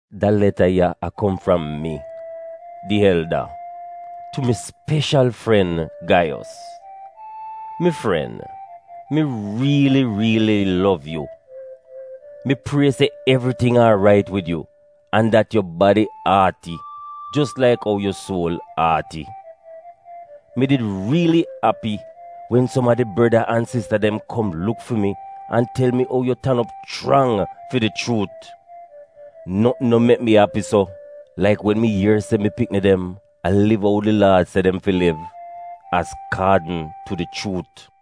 Da leta ya a kom fram mi, di Elda — tu mi speshal, fren Gaiyos. Mi fren, mi riili riili lov yu. Mi prie se evriting aarait wid yu, an dat yu badi aati jos laik ou yu suol aati. Mi did riili api wen som a di breda an sista dem kom luk fi mi an tel mi ou yu tan op chrang fi di chuut. Notn no mek mi api so laik wen mi ier se mi pikni dem a liv ou di Laad se dem fi liv — azkaadn tu di chuut.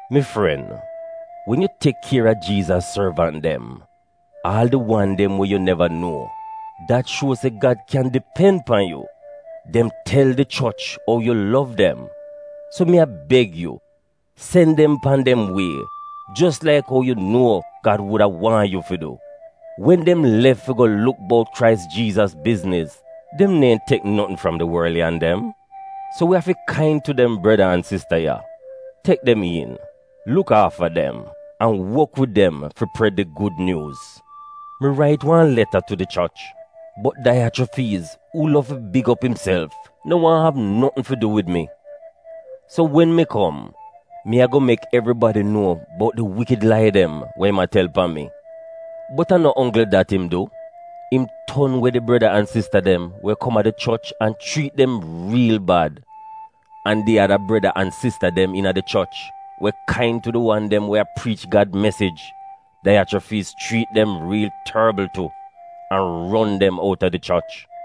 Mi fren, wen yu tek kier a Jiizas sorvant dem, aal di wan dem we yu neva nuo, dat shuo se Gad kyan dipen pan yu. Dem tel di choch ou yu lov dem. So mi a beg yu, sen dem pan dem wie jos laik ou yu nuo Gad wuda waahn yu fi du. Wen dem lef fi go luk bout Krais Jiizas bizniz, dem neehn tek notn fram di worliyan dem. So wi afi kain tu dem breda an sista ya, tek dem iin, luk aafa dem, an wok wid dem fi pred di Gud Nyuuz. Mi rait wan leta tu di choch, bot Daiyachrofiiz uu lov fi big op imself no waahn av notn fi du wid mi. So wen mi kom, mi ago mek evribadi nuo bout di wikid lai dem wa im a tel pan mi. Bot a no onggl dat im du, im ton we di breda an sista dem we kom a di choch an chriit dem riil bad. An di ada breda an sista dem iina di choch we kain tu di wan dem we a priich Gad mesij, Daiyachrofiiz chriit dem riil torbl tu, an ron dem outa di choch.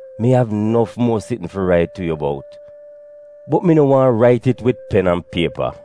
Mi av nof muo sitn fi rait tu yu bout, bot mi no waahn rait it wid pen an piepa.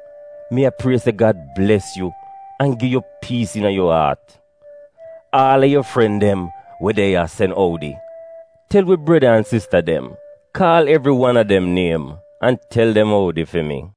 Mi a prie se Gad bles yu an gi yu piis iina yu aat. Aal a yu fren dem we de ya sen oudi. Tel wi breda an sista dem — kaal evri wan a dem niem, an tel dem oudi fi mi.